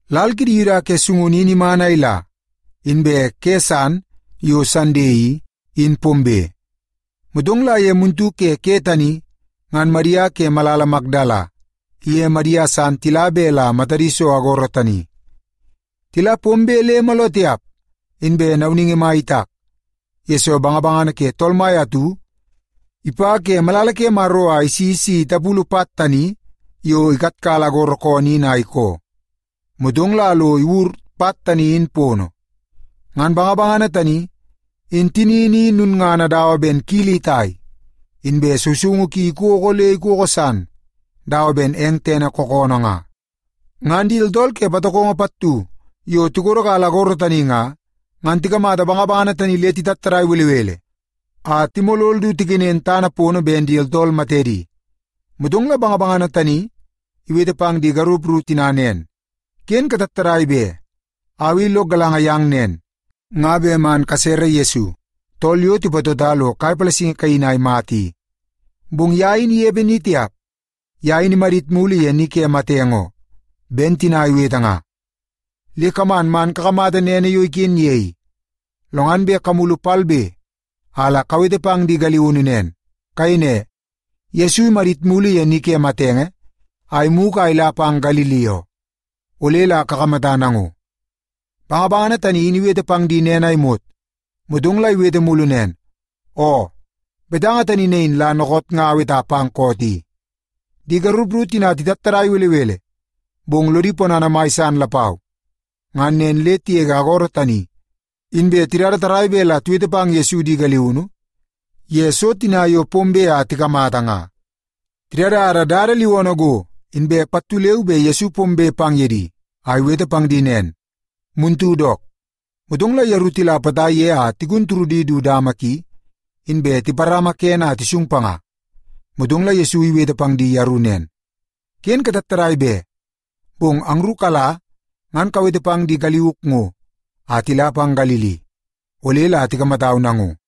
Lal kidi Yuda ke sungunu in iman a ila, inbe ke san yo Sande i, in pombe. Motong la ye muntu ke ke tani ngan Madia ke malala Makdala iye Madia san tila bet la matadi so agoro tani. Tila pombe le mooloo tiap, inbe nauningi mai itak, yesoo bangabangana ke Tool Mai atu ipa ke malala ke Maro a isi le si ipulu pat tani yo ikatkala agoro koonoo in a ikoo. Motong la lo iwur pat tani in pono. Ngan bangabangana tani, in tinini i lulngana dawa ben kili itai, inbe sousoungu ki ikoko le ikoko san dawa ben eng tene kookoonoo nga. Ngan di tooltool ke patokongo pattu yo tikodokala agoro tani nga, ngan tikamata bangabangana tani le titattadai belebele a timolol du tikenen tana pono ben di tooltool matedi. Motong la bangabangana tani iwete pang di garup ru tina nen, “Ken katattadai be! Au i lok galanga yang nen, nga bet man kasere Yesu, tool yo tipatota lo kai palasingi kaini a imata i. Bong ye in inepe ni tiap. Ye in imadit mulu ye ni ke matenge oo, ben tina iwete nga. Le kaman man kakamata nene yo iken ye i. Lo ngan bet kamulu palbe a la kawete pang di galiunu nen. Kayei ne, ‘Yesu imadit mulu ye ni ke matenge a imugu a ila pang Galili oo. Ole la kakamata nango.’” Bangabangana tani in iwete pang di nen a imot, motong la iwete mulu nen, “Oo, betanga tani nain la dookoot nga aweta pang koot i.” Di garup ru tina titattadai belebele, bong lodi ponana mai san lapau. Ngan nen le tigege agoro tani, inbe tidada tarrai bet la tiwete pang Yesu di galiunu ye so tina yo pombe a tikamata nga. Tidada dada liwoonoo go, inbe pattu leu be Yesu pombe pang ye di a iwete pang di nen, “Muntu dook.” Motong la yeru tila potai ye a tigun turudi du dama ki, inbe tiparama kene a tisung panga. Motong la Yesu iwete pang di yeru nen, “Ken katattadai be! Bong angru kala ngan kawete pang di taik ngo a tila pang Galili. Ole la tikamatau nango.”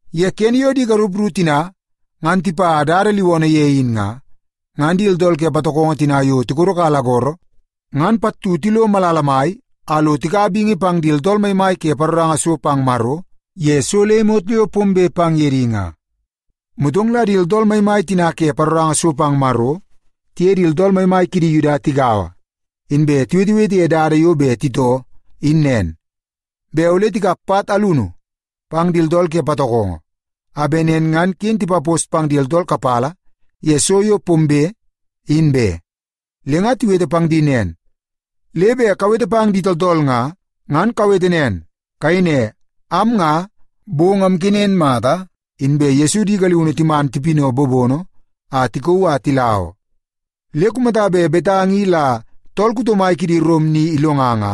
Ye kene yo di garup ru tina ngan tipa dada liwoonoo ye in nga, ngan di tooltool ke patokongo tina yo tikodokala agoro ngan pattu tilo malala mai a lo tikaua bingi pang di tooltool maimai ke paroranga so pang Maro, ye so le imot yo pombe pang ye di nga. Motong la di tooltool maimai tina ke paroranga so pang Maro tiye di tooltool maimai kidi Yuda tigaua, inbe tiwetewete ye dada yo bet titoo in nen, bet ole tikap pat alunu pang di tooltool ke patokongo a bet nen ngan ken tipapos pang di tooltool kapala ye so yo pombe, in be. Le nga tiwete pang di nen, “Le bet kawete pang di tooltool nga, ngan kawete nen. Kayei ne, ‘Am nga, bong amkenen mata, inbe Yesu di galiunu timan tipinaua bobono a tikauu a tila oo.’ Le kumata bet betanga i la tool kuto mai kidi Rom ni ilonga nga,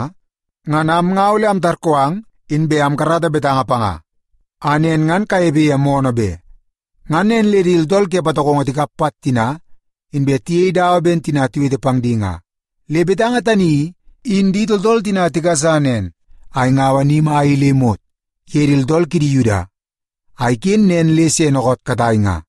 ngan am nga ole amtarkoo ang inbe amkarata betanga panga, a nen ngan kanepe ye moonoo be.” Ngan nen le di tooltool ke patokongo tikap pat tina, inbe tiyei dawa ben tina tiwete pang di nga. Le betanga tani i, in di tooltool tina tigasa nen a ingaua ni mai i le imot ye di tooltool kidi Yuda, a iken nen le se dookoot katai nga.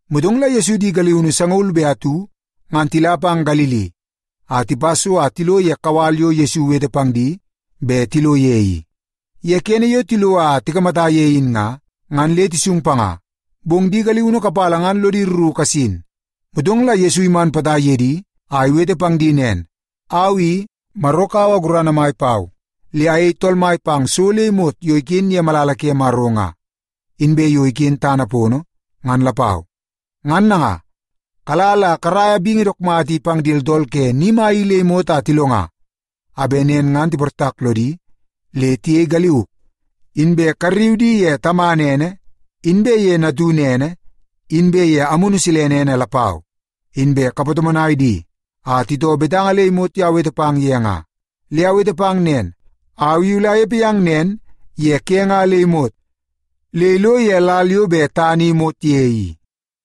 Motong la Yesu di galiunu sangaul be atu, ngan tila pang Galili a tipa so a tilo ye kawal yo Yesu iwete pang di bet tilo ye i. Ye kene yo tilo a tikamata ye in nga, ngan le tisung panga. Bong di galiunu kapala ngan lodi rru kasin. Motong la Yesu iman potai ye di a iwete pang di nen, “Au i, Maro kaua gurana mai pau, le ayei Tool Mai pang so le imot yo iken ye malala ke Maro nga, inbe yo iken tana pono, ngan lapau. Ngan nanga, kala la karaia bingi dook mata i pang di tooltool ke ni mai i le imot a tilonga, a bet nen ngan tiportak lodi le tiyei galiuk. Inbe karriu di ye Tamana ene, inbe ye Natunu ene, inbe ye Maro Amunu Silene ene lapau. Inbe kapatomonai di a titoo betanga le imot yo awete pang ye nga. Le awete pang nen, au i ole anepe yang nen ye ke nga le imot, le ilo ye lal yo bet tana i imot ye i.”